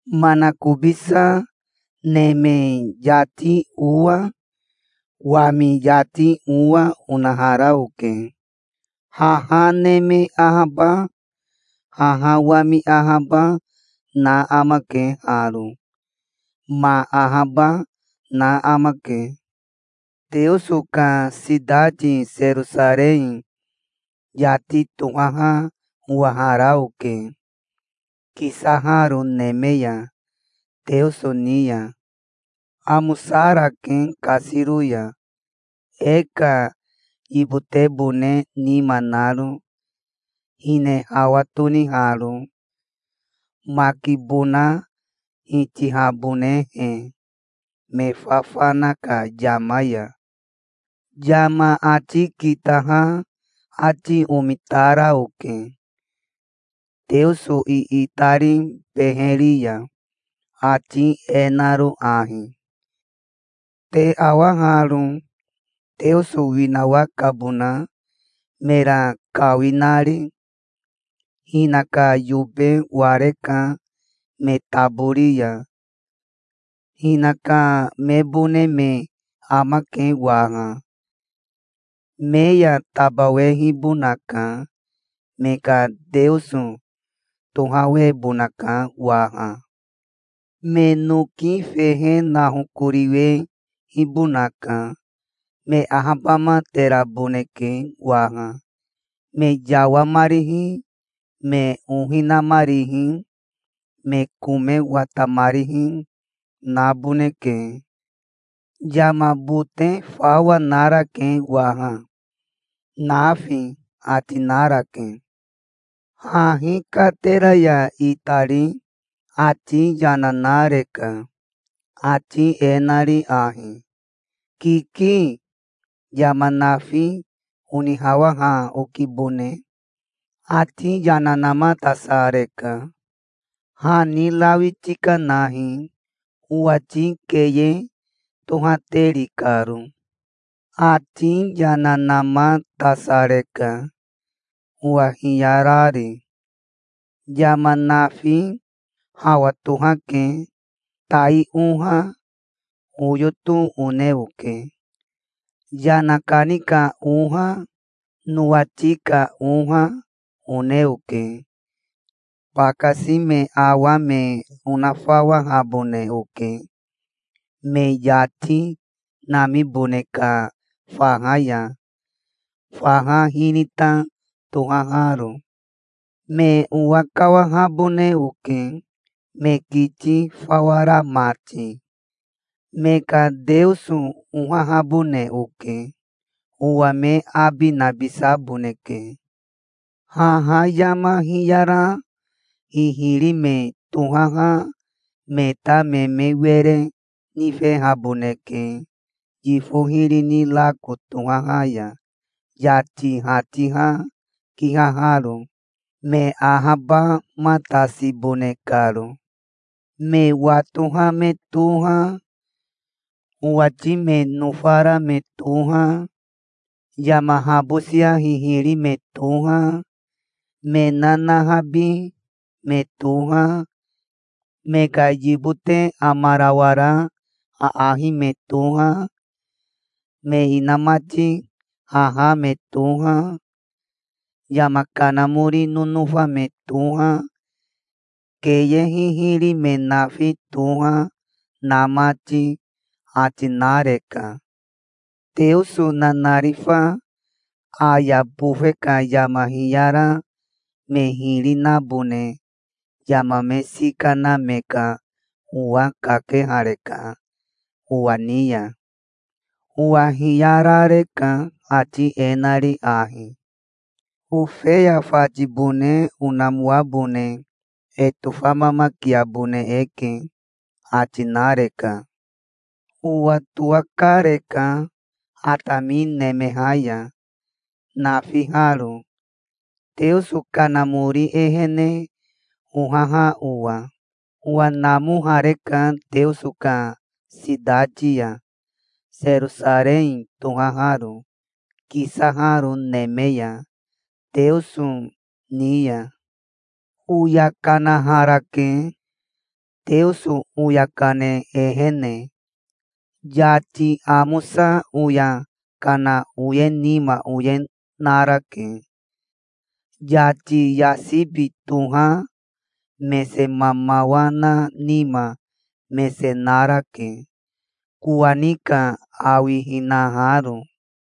Manakobisa neme yati owa wami yati owa onahara oke. Haha neme ahaba haha wami ahaba na amake haro. Ma ahaba na amake. Teoso ka sitati Serosarei yati tohaha owahara oke kisaharo neme ya, Teoso ni ya. Amosarake kasiro ya, e ka yibotebone nima naro, hine hawa toniharo, makibona hitihabonehe, me fafana ka yama ya. Yama ati kitaha ati omitara oke Teoso iitari beheri ya, ati e naro ahi: "Te awa haro. Teoso winawakabona, mera kawinari. Hinaka yobe wareka me tabori ya. Hinaka mebone me amake waha. Me ya tabawehibonaka. Me ka Teoso tohawebonaka waha. Me noki fehe nahokoriwehibonaka. Me ahabamateraboneke waha. Me yawamarihi, me ohi namarihi, me kome watamarihi, naboneke. Yama bote fawa narake waha, nafi", ati narake. Hahi katera ya itari ati yana nareka, ati e nari ahi: "Kiki. Yama nafi onihawaha okibone. Ati yana namatasareka. Hani rawi tikanahi, owati keye tohateri karo". Ati yana namatasareka, owa hiyarari. "Yama nafi hawa tohake. Tai oha, oyoto one oke. Yana kani ka oha, nowati ka oha one oke. Bakasi me awa me onafawahabone oke, me yati namibone ka faha ya, faha hinita tohaharo. Me owakawahabone oke, me kiti fawa ra mati. Me ka Teoso ohahabone oke. Owa me abi nabisaboneke. Haha yama hiyara hihiri me tohaha me ta me me were nifehaboneke yifo hiri ni rako tohaha ya yati hatiha kihaharo, me ahabamatasibone karo. Me watoha me toha, owati me nofara me toha, yama habosia hihiri me toha, me nanahabi me toha, me ka yibote amarawara aahi me toha, me inamati haha me toha, yama kanamori nonofa me toha, keye hihiri me nafi toha, na mati", ati nareka. Teoso nanarifa aya bofe ka yama hiyara me hiri nabone yama me sika na me ka owa kakehareka owa ni ya. Owa hiyarareka, ati e nari ahi: "Ofeya fatibone onamoabone e tofamamakiabone eke", ati nareka. Owa towakareka atami nemeha ya, nafiharo, Teoso Kanamori ehene ohaha owa. Owa namohareka Teoso ka sitati ya, Serosarei tohaharo, kisaharo neme ya, Teoso ni ya. Oya kanaharake Teoso oya kane ehene. Yati amosa oya kana oye nima oye narake. Yati yasibi toha mese mamawa na nima mese narake, kowani ka awi hinaharo.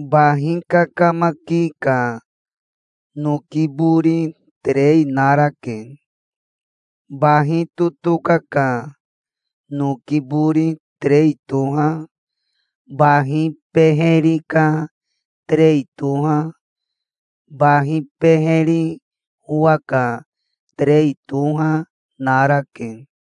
Bahi kakamaki ka noki bori terei narake. Bahi totoka ka noki bori terei toha, bahi beheri ka terei toha, bahi beheri owa ka terei toha, narake.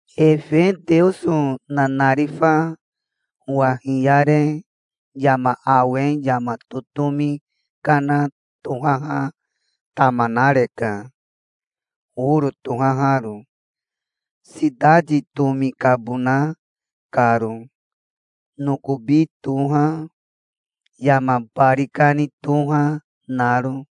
Efe Teoso nanarifa owa hiyare yama awe yama totomi kana tohaha tama nareka, oro tohaharo, sitati tomi kabona karo, nokobi toha, yama bari kani toha, naro.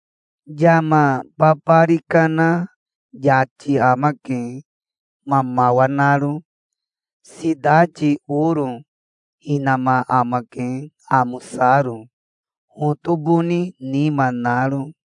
Yama babari kana yati amake, mamawa naro. Sitati oro hinama amake, amosaro, hotoboni nima naro.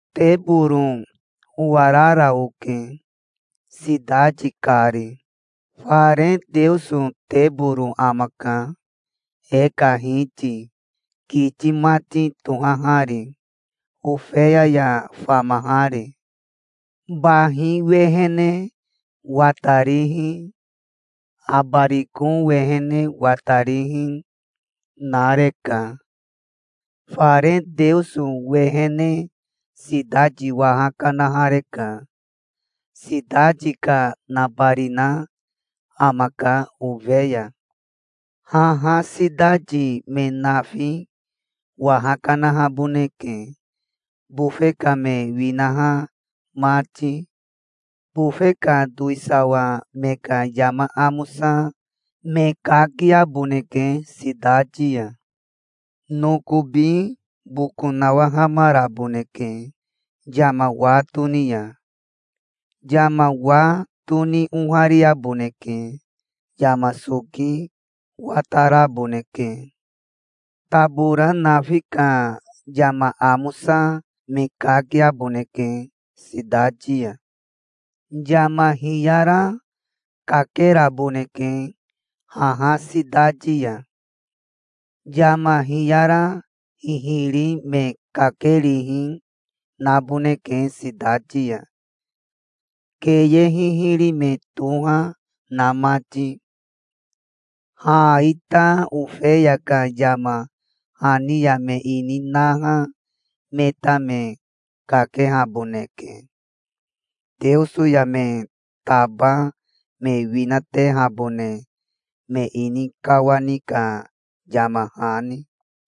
Teboro owarara oke sitati kari. Fare Teoso teboro amaka, e ka Hiti, kiti mati tohahari, Ofeya ya famahari. Bahi wehene watarihi, abariko wehene watarihi, nareka. Fare Teoso wehene sitati waha kanahareka. Sitati ka nabarina amaka, Ofeya. Haha sitati me nafi waha kanahaboneke, bofe ka me winaha mati. Bofe ka towisawa me ka yama amosa me kakiaboneke sitati ya. Nokobi boko nawahamaraboneke yama wa toni ya. Yama wa toni ohariaboneke. Yama soki wataraboneke. Tabora nafi ka yama amosa me kakiaboneke sitati ya. Yama hiyara kakeraboneke haha sitati ya. Yama hiyara hihiri me kakerihi naboneke sitati ya, keye hihiri me toha na mati. Ha ita Ofeya ka yama hani ya me ini naha me ta me kakehaboneke, Teoso ya me taba me winatehabone me ini kawani ka yama hani.